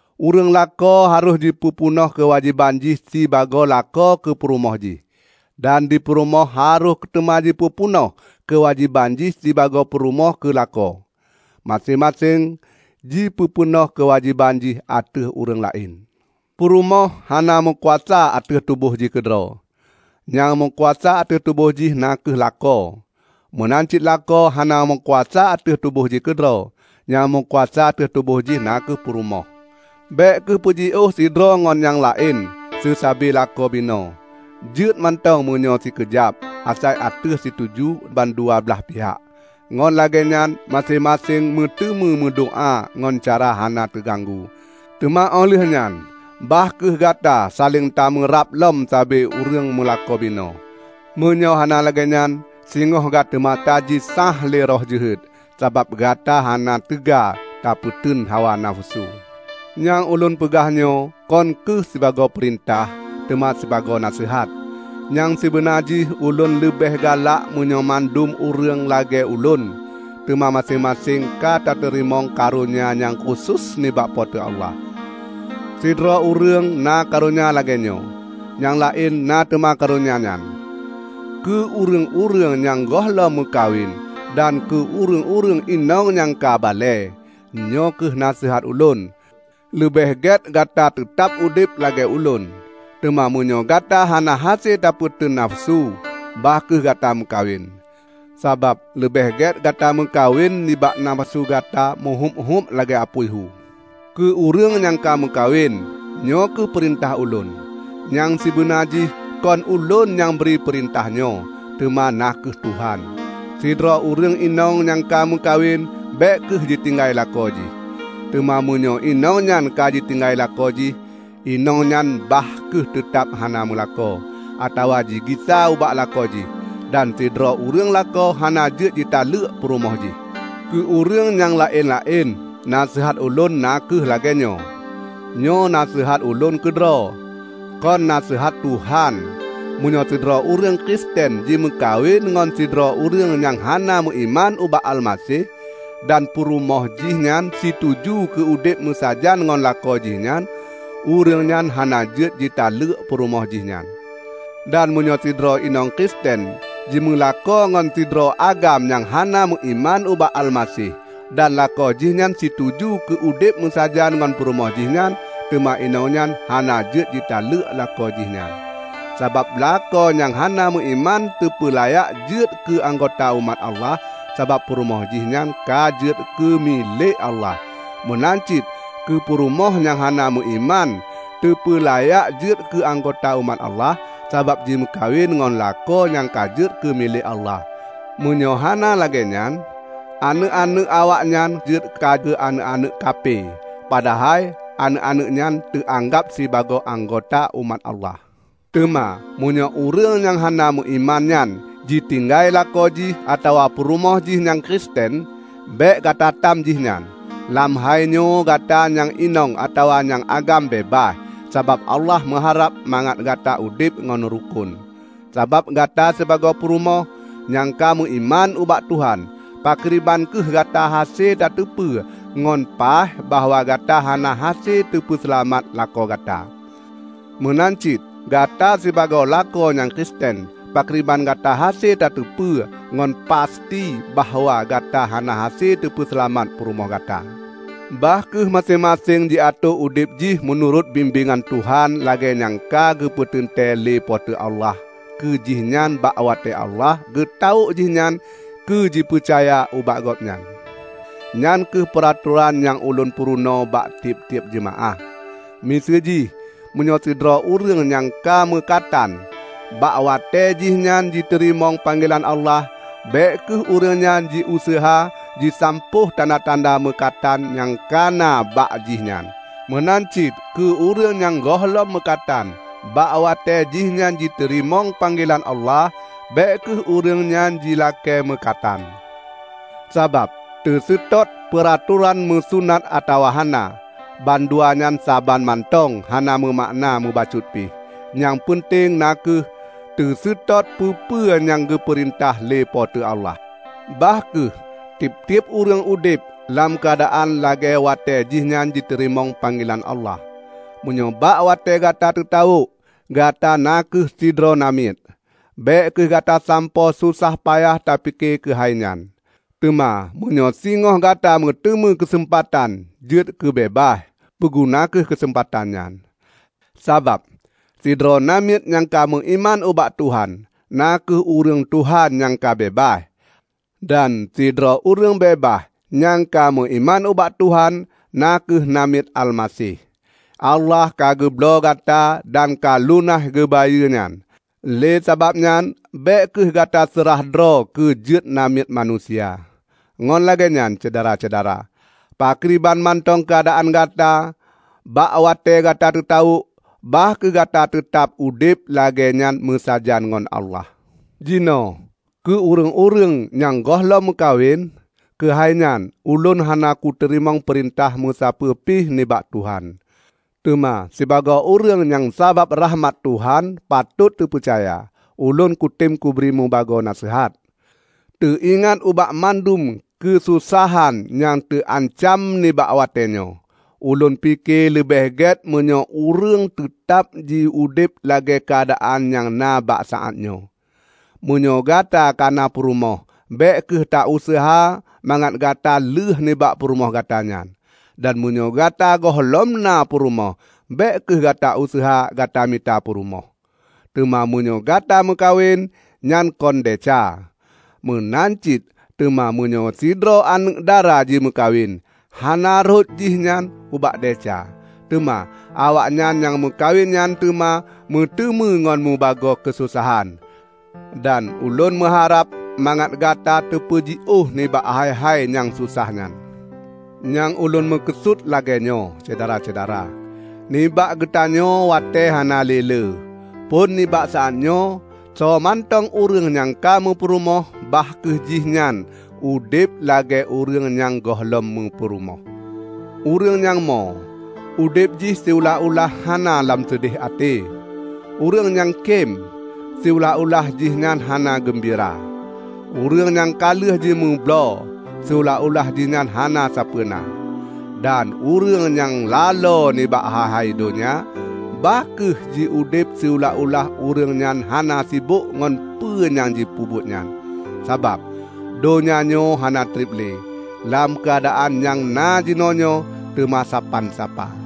Ureuëng lakoe harôh jipeupeunoh keuwajéban jih sibagoe lakoe keue purumoh jih, dan di purumoh harôh teuma jipeupeunoh keuwajéban jih sibagoe purumoh keue lakoe; maséng-maséng jipeupeunoh keuwajéban jih ateueh ureuëng laén. Purumoh hana meukuasa ateueh tuboh jih keudroe; nyang meukuasa ateueh tuboh jih na kheueh lakoe. Meunan cit lakoe hana meukuasa ateueh tuboh jih keudroe; nyang meukuasa ateueh tuboh jih na kheueh purumoh. Bék kheueh peujiôh sidroe ngon nyang laén seusabe lakoe binoe. Jeuet mantong meunyoe sikeujab, asai ateueh situju ban dua blaih pihak. Ngon lagée nyan maséng-maséng meuteumé meudoá ngon cara hana teuganggu. Teuma óh lheueh nyan bah kheueh gata saléng tameurab lom sibagoe ureuëng meulakoe binoe. Meunyoe hana lagée nyan, singoh gata teuma jisáh lé roh jeuhet, sabab gata hana teuga tapeuteun hawa nafeusu. Nyang ulôn peugah nyoe kon kheueh sibagoe peurintah, teuma sibagoe naseuhat. Nyang sibeuna jih ulôn leubeh galak meunyoe mandum ureuëng lagée ulôn. Teuma maséng-maséng ka teuterimong karonya nyang khusos nibak Po teu Allah. Sidroe ureuëng na karonya lagée nyoe, nyang laén na teuma karonya nyan. Keu ureuëng-ureuëng nyang gohlom meukawen dan keu ureuëng-ureuëng inong nyang ka balée, nyoe kheueh naseuhat ulôn: Leubeh gét Gata teutab udeb lagée ulôn. Teuma meunyoe Gata hana hase tapeuteun nafeusu, bah kheueh Gata meukawen. Sabab leubeh gét Gata meukawen nibak nafeusu gata meuhuéb-huéb lagée apui hu. Keu ureuëng nyang ka meukawen, nyoe kheueh peurintah ulôn: (Nyang sibeuna jih kon ulôn nyang bri peurintah nyoe, teuma na kheueh Tuhan.) Sidroe ureuëng inong nyang ka meukawen bék kheueh jitinggai lakoe jih. Teuma meunyoe inong nyan ka jitinggai lakoe jih, inong nyan bah kheueh teutab hana meulakoe, atawa jigisa ubak lakoe jih. Dan sidroe ureuëng lakoe hana jeuet jitaleuek purumoh jih. Keu ureuëng nyang laén-laén, naseuhat ulôn na kheueh lagée nyoe: -- nyoe naseuhat ulôn keudroe, kon naseuhat Tuhan -- meunyoe sidroe ureuëng Kristen jimeukawen ngon sidroe ureuëng nyang hana meuiman ubak Almaseh, dan purumoh jih nyan situju keu udeb meusajan ngon lakoe jih nyan, ureuëng nyan hana jeuet jitaleuek purumoh jih nyan. Dan meunyoe sidroe inong Kristen jimeulakoe ngon sidroe agam nyang hana meuiman ubak Almaseh, dan lakoe jih nyan situju keu udeb meusajan ngon purumoh jih nyan, teuma inong nyan hana jeuet jitaleuek lakoe jih nyan. Sabab lakoe nyang hana meuiman teupeulayak jeuet keu anggota umat Allah sabab purumoh jih nyan ka jeuet keu milék Allah. Meunan cit keu purumoh nyang hana meuiman teupeulayak jeuet keu anggota umat Allah, sabab jimeukawen ngon lakoe nyang ka jeuet keu milék Allah. Meunyoe hana lagée nyan, aneuëk-aneuëk awaknyan jeuet keu aneuëk-aneuëk kaphe, padahai aneuëk-aneuëk nyan teuanggab sibagoe anggota umat Allah. Teuma meunyoe ureuëng nyang hana meuiman nyan jitinggai lakoe jih atawa purumoh jih nyang Kristen, bék gata tam jih nyan. Lam hai nyoe Gata nyang inong atawa nyang agam beubaih, sabab Allah meuharab mangat Gata udeb ngon rukon. Sabab Gata sibagoe purumoh -- nyang ka meuiman ubak Tuhan -- pakriban kheueh Gata hase tateupeue ngon paih bahwa Gata hana hase tapeuseulamat lakoe gata? Meunan cit Gata sibagoe lakoe nyang Kristen, pakriban Gata hase tateupeue ngon pasti bahwa Gata hana hase tapeuseulamat purumoh gata? Bah kheueh maséng-maséng jiatoe udeb jih meunurot bimbéngan Tuhan lagée nyang ka geupeuteuntée lé Po teu Allah keu jihnyan bak watée Allah geutawök jihnyan keujipeucaya ubak Gobnyan. Nyan kheueh peuratoran nyang ulôn purunoe bak tieb-tieb jeumaáh. Miseujih, meunyoe sidroe ureuëng nyang ka meukatan bak watée jih nyan jiteurimong panggelan Allah, bék kheueh ureuëng nyan jiuseuha jisampôh tanda-tanda meukatan nyang ka na bak jih nyan. Meunan cit keu ureuëng nyang gohlom meukatan bak watée jihnyan jiteurimong panggelan Allah, bék kheueh ureuëng nyan jilakée meukatan. Sabab teuseutôt peuratoran meusunat atawa hana, bandua nyan saban mantong hana meumakna meubacut pih. Nyang peunteng na kheueh teuseutôt peue-peue nyang geupeurintah lé Po teu Allah. Bah kheueh tieb-tieb ureuëng udeb lam keuadaan lagée watée jihnyan jiteurimong panggelan Allah. Meunyoe bak watée Gata teutawök, Gata na kheueh sidroe namiet, bék kheueh Gata sampoe sosah payah tapike keuhai nyan. Teuma meunyoe singoh Gata meuteumé keuseumpatan jeuet keubeubaih, peuguna kheueh keuseumpatan nyan. Sabab sidroe namiet nyang ka meuiman ubak Tuhan, na kheueh ureuëng Tuhan nyang ka beubaih. Dan sidroe ureuëng beubaih nyang ka meuiman ubak Tuhan, na kheueh namiet Almaseh. Allah ka geubloe Gata dan ka lunaih geubayeue nyan. Lé sabab nyan, bék kheueh Gata seurah droe keu jeuet namiet manusia. Ngon lagée nyan, Syedara-syedara, pakriban mantong keuadaan gata bak watée gata teutawök, bah kheueh Gata teutab udeb lagée nyan meusajan ngon Allah. Jinoe keu ureuëng-ureuëng nyang gohlom meukawen. Keu hai nyan, ulôn hana kuteurimong peurintah meusapeue pih nibak Tuhan. Teuma sibagoe ureuëng nyang sabab rakhmat Tuhan patot teupeucaya, ulôn kutem kubri mubagoe naseuhat. Teuingat ubak mandum keusosahan nyang teuancam nibak watée nyoe, ulôn pike leubeh gét meunyoe ureuëng teutab jiudeb lagée keuadaan nyang na bak saát nyoe. Meunyoe Gata kana purumoh bék kheueh ta useuha mangat gata lheuh nibak purumoh gata nyan. Dan meunyoe Gata gohlom na purumoh bék kheueh gata useuha gata mita purumoh. Teuma meunyoe Gata meukawen, nyan kon desya. Meunan cit teuma meunyoe sidroe aneuëk dara jimeukawen, hana rhot jih nyan ubak desya. Teuma, awaknyan nyang meukawen nyan teuma meuteumé ngon mubagoe keusosahan. Dan ulôn meuharab mangat Gata teupeujiôh nibak hai-hai nyang sosah nyan. Nyang ulôn meukeusut lagée nyoe, Syedara-syedara: Nibak geutanyoe watée hana le lé. Phon nibak saát nyoe, soe mantong ureuëng nyang ka meupurumoh bah kheueh jih nyan udeb lagée ureuëng nyang gohlom meupurumoh; ureuëng nyang mo, udeb jih siulah-ulah hana lam seudeh até; ureuëng nyang kém, siulah-ulah jih nyan hana geumbira; ureuëng nyang ka lheueh jimeubloe, siulah-ulah jihnyan hana sapeue na; dan ureuëng nyang laloe nibak hai-hai donya, bah kheueh jiudeb siulah-ulah ureuëng nyan hana sibok ngon peue nyang jipeubuet nyan. Sabab, donya nyoe hana treb le, lam keuadaan nyang na jinoenyoe, teuma sapan sapa!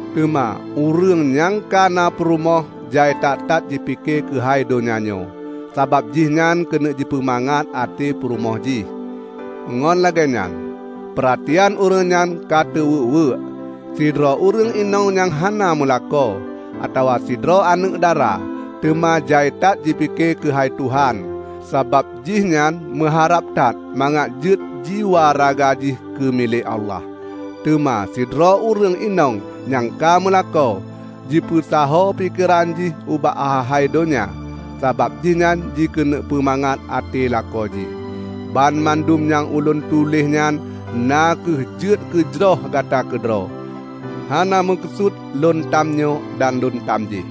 Teuma ureuëng nyang ka na purumoh jai that-that jipike keuhai donya nyoe, sabab jihnyan keuneuk jipeumangat até purumoh jih; ngon lagée nyan, peuratian ureuëng nyan ka teuweuek-weuek. Sidroe ureuëng inong nyang hana meulakoe, atawa sidroe aneuëk dara, teuma jai that jipike keu hai Tuhan, sabab jihnyan meuharab that mangat jeuet jiwaraga jih keu milék Allah. Teuma sidroe ureuëng inong nyang ka meulakoe, jipeusaho pikeran jih ubak hai-hai donya, sabab jih nyan jikeuneuk peumangat até lakoe jih. Banmandum nyang ulôn tuléh nyan na kheueh jeuet keujroh gata keudroe, hana meukeusut lôn tam nyoe dan lôn tam jéh.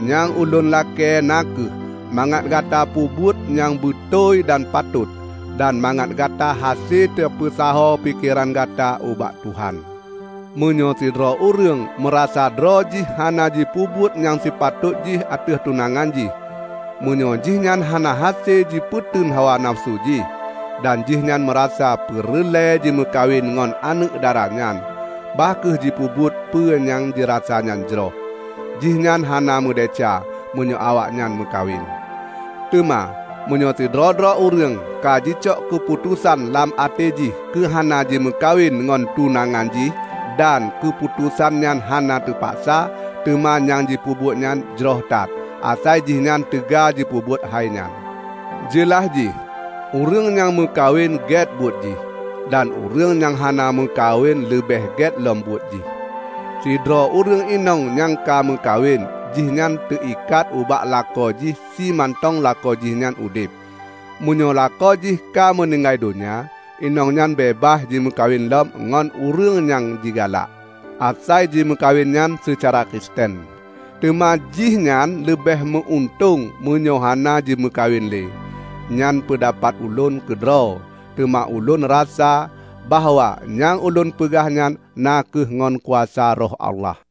Nyang ulôn lakée na kheueh mangat Gata peubuet nyang beutôi dan patot, dan mangat Gata hase tapeusaho pikeran gata ubak Tuhan. Meunyoe sidroe ureuëng meurasa droe jih hana jipeubuet nyang sipatot jih ateueh tunangan jih, meunyoe jihnyan hana hase jipeuteun hawa nafeusu jih, dan jihnyan meurasa peureulée jimeukawen ngon aneuëk dara nyan, bah kheueh jipeubuet peue nyang jirasa nyan jroh. Jihnyan hana meudesya meunyoe awaknyan meukawen. Teuma meunyoe sidroe-droe ureuëng ka jicok keuputosan lam até jih keu hana jimeukawen ngon tunangan jih dan keuputosan nyan hana teupaksa, teuma nyang jipeubuet nyan jroh that, asai jihnyan teuga jipeubuet hainyan. Jeulaih jih, ureuëng nyang meukawen gét buet jih, dan ureuëng nyang hana meukawen leubeh gét lom buet jih. Sidroe ureuëng inong nyang ka meukawen jihnyan teuikat ubak lakoe jih simantong lakoe jih nyan udeb. Meunyoe lakoe jih ka meuninggai donya, inong nyan beubaih jimeukawen lom ngon ureuëng nyang jigalak; asai jimeukawen nyan seucara Kristen. Teuma jihnyan leubeh meu-untông meunyoe hana jimeukawen le. Nyan peundapat ulôn keudroe, teuma ulôn rasa bahwa nyang ulôn peugah nyan na kheueh ngon kuasa Roh Allah.